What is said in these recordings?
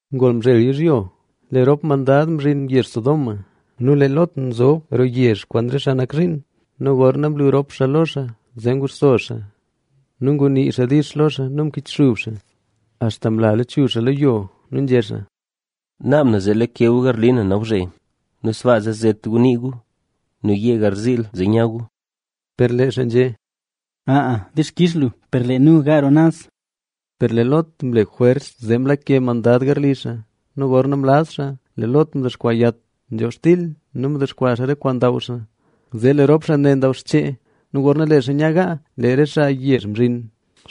Ngol mzhel yizhyo, lee rop mandad mzhin yezh Sodoma; nu lee Lot nzob roo yezh kwaan re xaa nak zhiin. Nu gorna mlu rop xaa lo xaa zee nguxso xaa nu ngunii xaa dix lo xaa nu mkichxub xaa axta mla lachuzh xaa lo yo. Nu nzhé xaa: —Naab na zee lakeka gu garli na nawzhe nu sbaa zee zet gu nii gu; nu yee garziil zee nya gu. Per lee xaa nzhé: —Aa, dixkix lu, per lee nu gaa roo naz. Per lee Lot mle jwers zee mlake mandad garli xaa. Nu gorna mlaz xaa, lee Lot mdexkwaa yat nzhob xtil nu mdexkwaa re kwaan ndaw xaa. Zee lee rop xaa ndaw xchee. Nu gorna lee xaa nya gaa, lee re xaa yezh mzhin,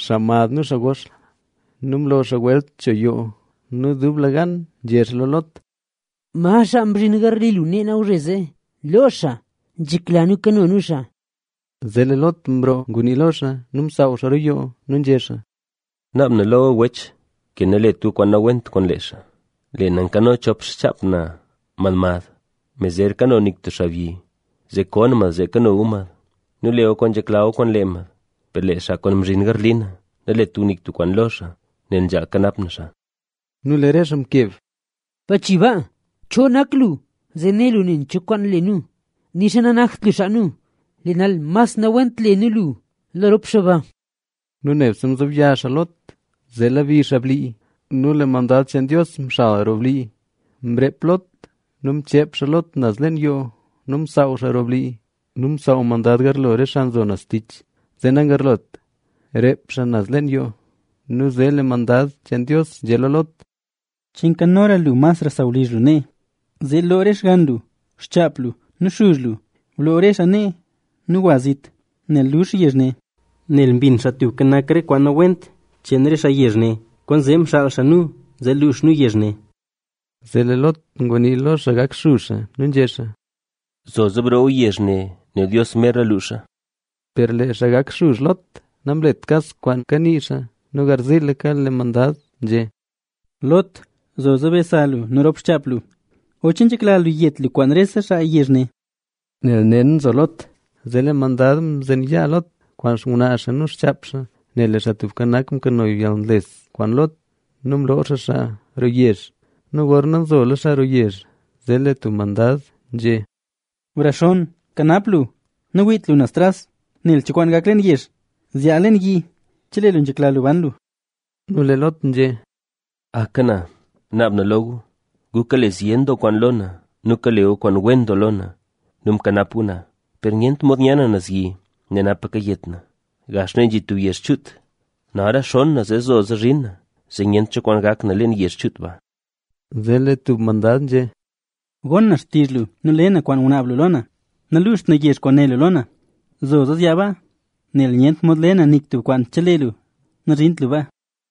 xaa mad nu xaa gox nu mlo xaa welt cho yoo. Nu dublegan nzhé xaa lo Lot: —¿Ma xaa mzhin garli lu nee nawzhe? ¡Loo xaa, nzhekla nu kano nu xaa! Zee lee Lot mroo ngunii lo xaa nu msaaw xaa roo yoo. Nu nzhé xaa: —Naab na lo gu wech, ke nalet gu kwaan nawent kwaan lee xaa. Lee na nkano chop xchaap na mad mad, me zer kano nik tub xaabyi, zee ko na mad zee kano gu mad nu le gu kwaan nzhekla gu kwaan lee mad. Per lee xaa kwaan mzhin garli na, nalet gu nik tub kwaan lo xaa, nel nzhaal kanap na xaa. Nu lee re xaa mkeb: —¡Bachi baa! ¿Cho nak lu zee né lu nen cho kwaan le nu? Nixa nanakt lu xaa nu. Lee nal mas nawent le nu lu lo rop xaa ba. Nu nebse mzobya xaa Lot, zee mlebi xaa blii. Nu lee mandad cheen Dios mxal roo blii, mre Lot nu mcheep xaa Lot naz leen yoo nu msaaw xaa roo blii. Nu msaaw mandad garlo re xaa nzo naz tich, zee nagarlot reep xaa naz leen yoo. Nu zee lee mandad cheen Dios nzhé lo Lot: —¿Che nkanora lu masra sawlizh lu nee? Zee loo re xgann lu, xchaap lu nu xuzh lu, bloo re xaa nee nu gwa zit, nel luux nu yezh ne. Nu mbin Xaa Tubka Nak re kwaan nawent cheen re xaa yezh ne, kwaanzee mxaal xaa nu zee luux nu yezh ne. Zee lee Lot ngwa nii lo xaa gak xuzh xaa nu nzhé xaa: —Zoza broo yezh ne, nel Dios merla luuxa. Per lee xaa gak xuzh Lot namlet kas kwaan kanii xaa. Nu garziilaka lee mandad nzhé: —Lot, zoza be sa lu nu rop xchaap lu, o ¿che nzhekla lu yet lu kwaan rese xaa yezh ne? Nu nel naxen nzo Lot, zee lee mandad mzen yaa Lot kwaan xngwnaa xaa nu xchaap xaa, nel lee Xaa Tubka Nak mkano yalnles kwaan Lot, nu mloo xaa xaa roo yezh. Nu gorna nzola xaa roo yezh, zee lee tub mandad nzhé: —¡Brexonn! ¡Kanap lu! Nawiit lu naz tras nel cho kwaan gak leen yezh. Zyaa leen yi, chelee lu nzhekla lu ban lu. Nu lee Lot nzhé: —¡Aka na, naab na lo gu! Gu kale zyen doo kwaan lo na nu kale gu kwaan wen doo lo na nu mkanap gu na, per nyent mod nya na naz yi, nel napa kayet na. Gax nee nzhi tub yezh chuut, nal rexonn na zee zoza zhin na, zee nyent cho kwaan gak na leen yezh chuut ba. Zee lee tub mandad nzhé: —Gon na xtizh lu nu le na kwaan ngunaab lu lo na. Naluuxt na yezh kwaan né lu lo na. Zoza zyaa baa, nel nyent mod le na nik tub kwaan chelee lu nazhint lu baa.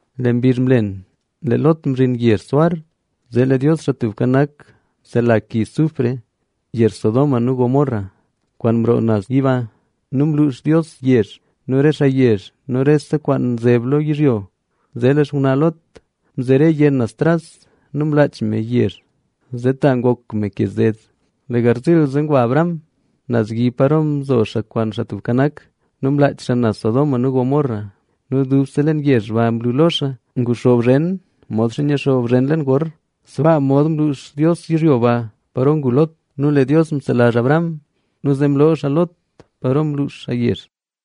Lee mbizh mlen, lee Lot mzhin yezh Zoar. Zee lee Dios, Xaa Tubka Nak, msela ki sufre yezh Sodoma nu Gomorra, kwaan mroo naz yiba. Nu mluux Dios yezh nu re xaa yezh nu rese kwaan nzeb lo yizhyo. Zee lee xngwnaa Lot mzere yenn naz tras nu mlaach me yezh, zee ta ngok me ke zed. Lee garziil ze ngwa Abraham naz yi paro mzo xaa kwaan Xaa Tubka Nak. Nu mlaach xaa naz Sodoma nu Gomorra nu dubse leen yezh ba mlu lo xaa, nguxoob zhen modxa nyixoob zhen leen gor. Sbaa mod mluux Dios yizhyo ba paro ngu Lot. Nu lee Dios mselazh Abraham nu zee mloo xaa Lot paro mluux xaa yezh.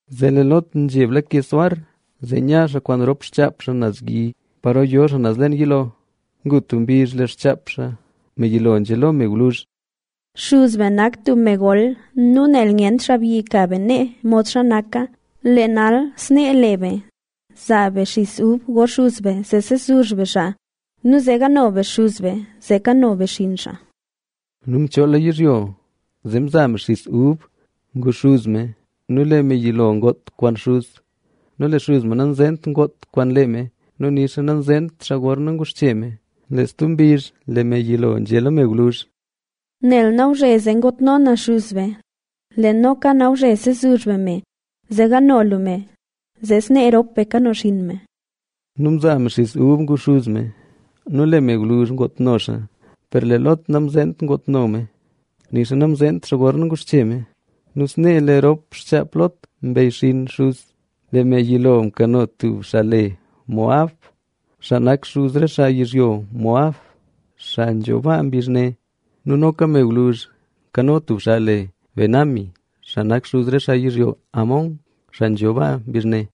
Zee lee Lot nzheb lake Zoar, zee nya xaa kwaan rop xchaap xaa naz yi paro yo xaa naz leen yiloo. Ngu tub mbizh, lee xchaap xaa, me yilo nzhé lo me gwluzh: —Xuz be nak tub me gol. Nu nel nyent xaabyi ka be nee modxa naka, lee nal, snee le be: Zaa be xis ub go xuz be zee sezuzh be xaa nu zee gaano be xuz be, zee kano be xinn xaa. Nu mchoola yizhyo zee mzaa me xis ub ngu xuz me. Nu lee me yilo ngoot kwaan xuz. Nu lee xuz me nanzeent ngoot kwaan lee me nu nixa namzeent xaa gorna nguxche me. Lee stub mbizh lee me yilo nzhé lo me gwluzh: —Nel nawzhezee ngootno na xuz be. Lee noka nawzhe sezuzh be me, zee gaano lu me, zee snee rop be kano xinn me. Nu mzaa me xis ub ngu xuz me nu lee me gwluzh ngootno xaa, per lee Lot namzeent ngootno me, nixa namzeent xaa gorna nguxche me. Nu snee lee rop xchaap Lot mbeyxinn xuz. Lee me yilo mkano tub xaa le Moab, xaa nak xuz re xaa yizhyo Moab, xaa nzho baa mbizh ne. Nu noka me gwluzh nkano tub xaa le Ben-ammi, xaa nak xuz re xaa yizhyo Ammon, xaa nzho baa mbizh ne.